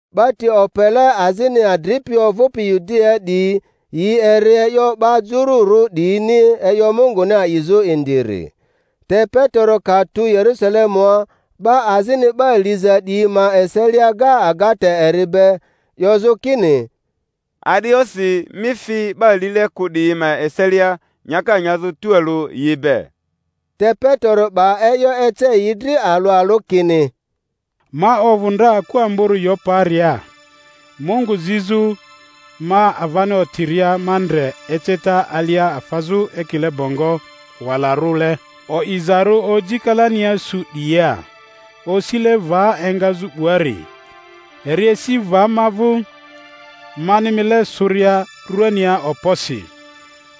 Ba ti opele azini adripi ovᴜpi Yudiaa 'diyi, yi eri e'yo 'ba Jururᴜ 'diyini e'yo Munguni a'izᴜ indiri. Te Petero ka tu Yerusalemua, 'ba azini 'ba liza 'diyi ma eselia ga agata eri be, 'yozᴜ kini, A'di e'yosi mi fi 'ba lile kᴜ 'diyi ma eselia nyaka nyazᴜ tualᴜ yi be? Te Petero 'ba e'yo ece yi dri alᴜ alᴜ kini: Ma ovᴜ ndra aku amborᴜ Yoparia Mungu zizᴜ; ma avani otiria ma ndre eceta alia afazᴜ ekile bongo walarᴜle, o'izarᴜ oji kalania su 'diyia, osile va engazᴜ 'buari; eri esi va ma vᴜ. Mani mile sᴜria ruania okposi,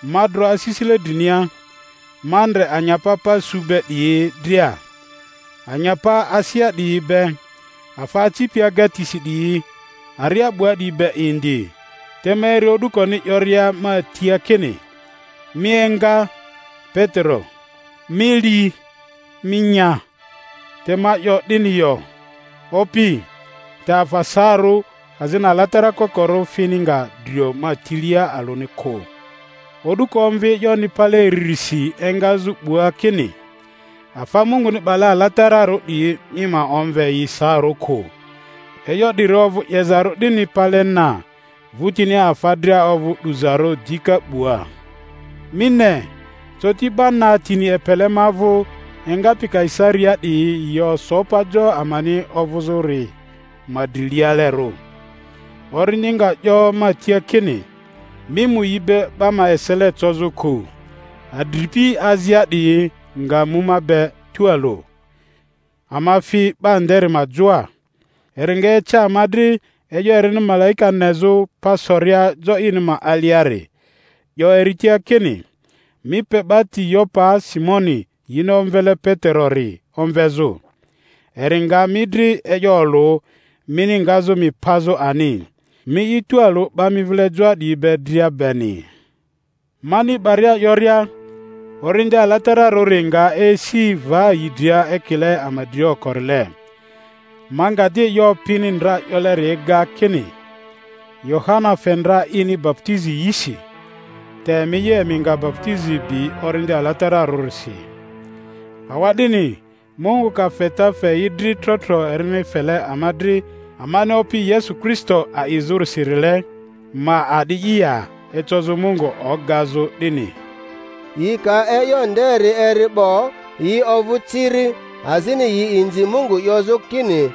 ma dro asisile drinia, ma ndre anyapa pa su be 'diyi dria, anyapa asea 'diyi be, afa acipi agatisi 'diyi, aria 'bua 'diyi be indi. Te ma eri o'dukoni 'yoria ma tia kini, Mi enga, Petero; mi li, mi nya. Te ma 'yo, 'Dini yo, Opi; te afa saarᴜ azini alatara kokorᴜ fini nga drio ma tilia alᴜni kᴜ. O'duko omvi e'yoni pale iririsi engazᴜ 'bua kini, Afa Munguni 'bale alatararᴜ 'diyi mi ma omve yi saarᴜ kᴜ. E'yo 'diri ovᴜ 'yezarᴜ 'dini pale na, vᴜtinia afa dria ovᴜ 'duzarᴜ dika 'bua. Mi ne, coti 'ba na tini epele ma vᴜ engapi Kaisariaa 'diyi yi oso pa jo amani ovᴜzᴜri ma drilialerᴜ. Orindi nga 'yo ma tia kini, Mi mu yi be 'ba ma esele cozᴜ kᴜ. Adripi azia 'diyi nga mu ma be tualᴜ, ama fi 'ba nderi ma joa. Eri nga ece ama dri e'yo erini malaika nezᴜ pa soria jo ini ma aliari, 'yo eri tia kini, Mi pe 'ba ti Yopaa Simoni yini omvele Peterori omvezᴜ; eri nga mi dri e'yo olᴜ mini ngazᴜ mi pazᴜ ani, mi'i tualᴜ 'ba mi vile joa 'diyi be dria beni. Mani 'baria 'yoria, Orindi Alatararᴜri nga esi va yi dria ekile ama dria okorile. Ma nga di e'yo Opini ndra 'yoleri ega, kini, Yohana fe ndra ini baputizi yisi, te emi'i, emi nga baputizi bi Orindi Alatara-rᴜsi. Awa'dini Mungu ka feta fe yi dri trotro erini fele ama dri amani Opi Yesu Kristo a'izᴜrisirile, ma a'di'i ya ecozᴜ Mungu ogazᴜ 'dini? Yi ka e'yo nderi eri 'bo, yi ovᴜ ciri, azini yi inzi Mungu 'yozᴜ kini,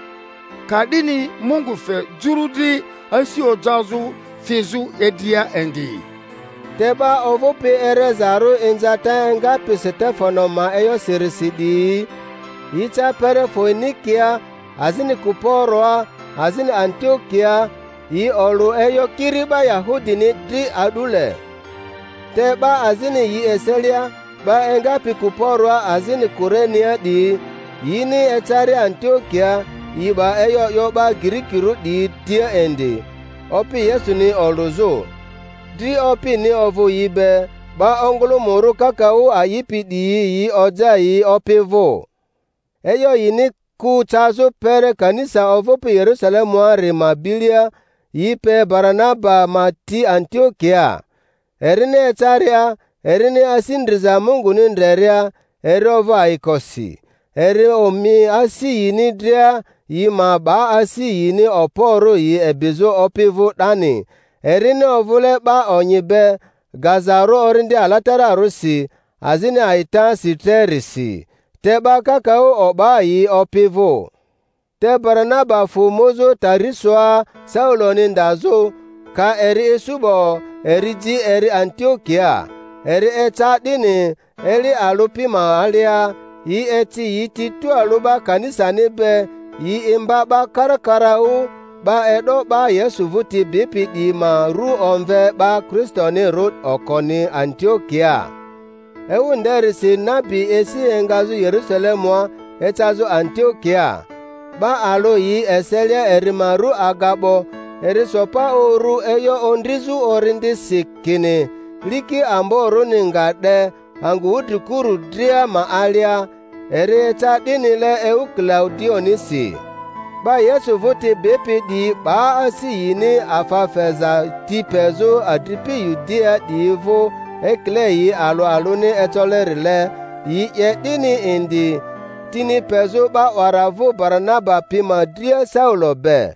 Ka'dini Mungu fe Juru dri asi ojazᴜ fizᴜ idria indi. Te 'ba ovᴜpi erezarᴜ inzata engapi Setefano ma e'yosirisi 'diyi, yi ca kpere Foenikia azini Kuporoa azini Antiokiaa, yi olᴜ e'yo kiri 'ba Yahudini dri a'dule. Te 'ba azini yi eselia, 'ba engapi Kuporoa azini Kurenea 'diyi, yini ecaria Antiokiaa yi 'ba e'yo 'yo 'ba Girikirᴜ 'diyi tia indi, Opi Yesuni olᴜzᴜ. Dri Opini ovᴜ yi be, 'ba ongᴜlᴜmᴜrᴜ kakaᴜ a'ipi 'diyi yi oja yi Opi vᴜ. E'yo yini ku cazᴜ kpere kanisa ovᴜpi Yerusalemuari ma bilia, yi pe Baranaba ma ti Antiokiaa. Erini ecaria, erini asi ndriza Munguni ndreria, eri ovᴜ ayikosi; eri omi asi yini dria yi ma 'ba asi yini okporᴜ yi ebizᴜ Opi vᴜ 'dani; erini ovᴜle 'ba onyi be, gazarᴜ Orindi Alatara-rᴜsi azini a'itasi trerisi. Te 'ba kakaᴜ o'ba yi Opi vᴜ. Te Baranaba fᴜ muzᴜ Tarisoa Sauloni ndazᴜ; ka eri isu 'bo, eri ji eri Antiokiaa. Eri eca 'dini, eli alᴜ pi ma alia yi eci yi ti tualᴜ 'ba kanisani be, yi imba 'ba karakaraᴜ; 'ba e'do 'ba Yesu vᴜti bipi 'diyi ma rᴜ omve 'ba Kristonirᴜ okoni Antiokiaa. Ewu nderisi nabi esi engazᴜ Yerusalemua ecazᴜ Antiokiaa. 'Ba alᴜ yi eselia eri ma rᴜ Agabo, eri so pa uru e'yo ondrizᴜ Orindisi kini liki amborᴜni nga 'de angᴜ wudrikurᴜ dria ma alia; eri eca 'dinile ewu Kilaudionisi. 'Ba Yesu vᴜti bipi 'diyi 'ba asi yini afa feza ti pezᴜ adripi Yudiaa 'diyi vᴜ ekile yi alᴜ alᴜni ecolerile; yi 'ye 'dini indi, tini pezᴜ 'ba 'wara vᴜ Baranaba pi ma dria Saulo be.